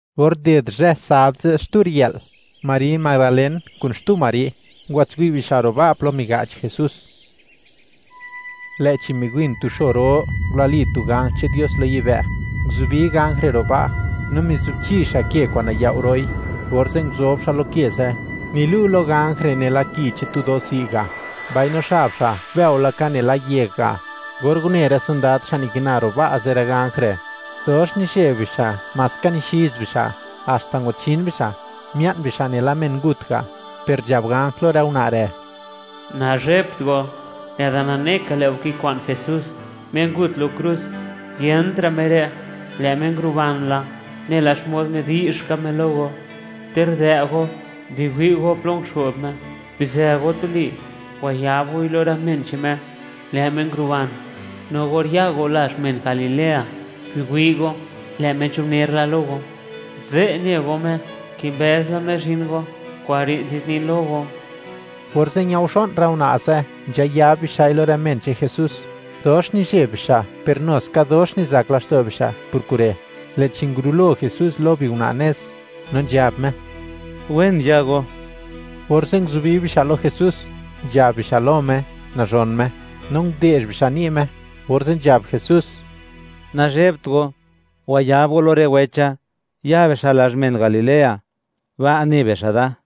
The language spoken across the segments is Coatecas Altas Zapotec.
Or nded zhë sabd ze' xtu riyë'l, Mari Madalen kun xtu Mari, ngwatswi' bixa' ro' ba' plo miga'ch Jesús. Lë'chi miwin tu xo ro, ngulali tu ganj che'n Dios lo yibë', nguzubi ganj re' ro' ba', no mizubchi xa' ke kwa'n nayao' ro'i, orze' nguzob xa' lo ke ze'. Nilu' lo ganj re' nela ki che'n tu do'zi' ga', mbaino xab xa', bëo laka nela yeg ga'. Or une rë sondad xa' kikina ro' ba' ze' rë ganj re', dox nizheb bixa' maska nixiz bixa' haxta ngwachin bixa', mia'n bixa' nela men ngut ga'; per nzhab ganj lo rë una' re': ―Nazhebt go, lë'da nane ka lë' go kikwa'n Jesús, Me ngut lo krus. Yent ra' Me re', lë' Me nguruban la, nela xmod midi'zh ka Me lo go, ter dë' go, biwi' go plo nguxo'b Me. Bizë go tuli, wayab goi lo rë men che'n Me, lë' Me nguruban; no or ya go lazh men Galilea, biwi' go, lë' Me nzhubner la lo go; ze' ne go Me, kimbëz la Me zhin go; kure' nzadnin lo go. Orze' ñaoxo'n rë una' ze' nzhayab bixa'i lo rë men che'n Jesús; dox nizheb bixa' per nu ska dox nizak laxto' bixa' por kure'. Lë'chi, ngurulo Jesús lo biuna' nez, no nzhab Me: “¡Wen ya go!”, orze' nguzubi bixa' lo Jesús, nzhab bixa' lo Me nazhon Me, no nde'zh bixa' ni' Me, orze' nzhab Jesús: ―Nazhebt go; wayab go lo rë wecha, ya bixa' lazh men Galilea; ba' ne bixa' da.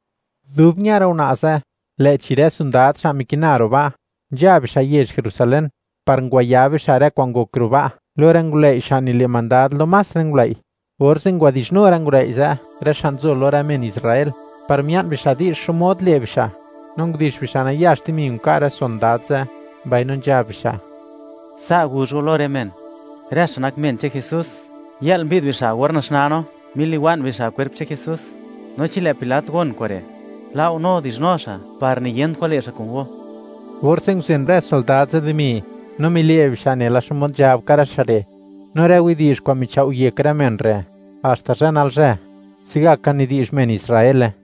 Dub ña rë una' ze', lë'chi rë sondad xa' mikina ro' ba', nzha bixa' yezh Jerusalén, par ngwayab bixa' rë kwa'n ngok ro' ba', lo rë ngulëi' xa' nile' mandad lo más rë ngulëi'. Orze' ngwadi'zhnu rë ngulëi' ze', rë xa' nzo lo rë men Israel, par mia'n bixa' di'zh xmod le' bixa', no ndix bixa' nayax dimi, nka' rë sondad ze', mbaino nzhab bixa': ―Sa' guzh go lo rë men: “Rë xa' nak men che'n Jesús, yë'l mbi'd bixa' or naxnaa no, miliwa'n bixa' kwerp che'n Jesús”, no chi lë' Pilat gon kure', la'u no dizhnu xa' par niyent kwan le' xa' kun go. Orze' nguzen rë sondad ze' dimi, no mile' bixa' nela xmod nzhab ka rë xa' re'; no rë widi'zh kwa'n michao' yek rë men re', haxta zhë nalzhë, se'gaka nidi'zh men Israele.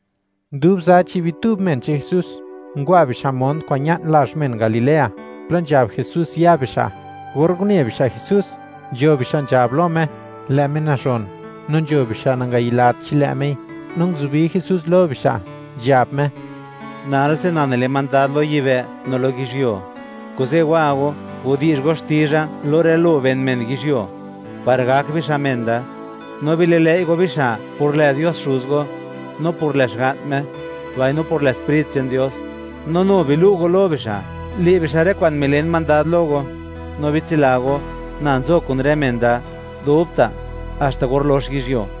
Dub za chi' bitub men che'n Jesús, ngwa bixa' mont kwa'n ña'n lazh men Galilea, plo nzhab Jesús ya bixa'. Or une bixa' Jesús, nzho bixa' nzhab lo Me, lë' Me nazhon, no nzho bixa' nangayilat chi lë' Mei. No nguzubi Jesús lo bixa', nzhab Me: ―Nalse na nile mandad lo yibë' no lo yizhyuo; kuze' wa go, gudi'zh go xti'zha lo rë lo ben men yizhyuo par gak bixa' men da, no bililëi' go bixa' por lë Dios Xuz go, no por lë Xga'n Me, mbaino por lë Sprit che'n Dios; no nu bilu' go lo bixa', le' bixa' rë kwa'n milen mandad lo go; no bitsila go, na nzo kun rë men da dubta', haxta or lox yizhyuo.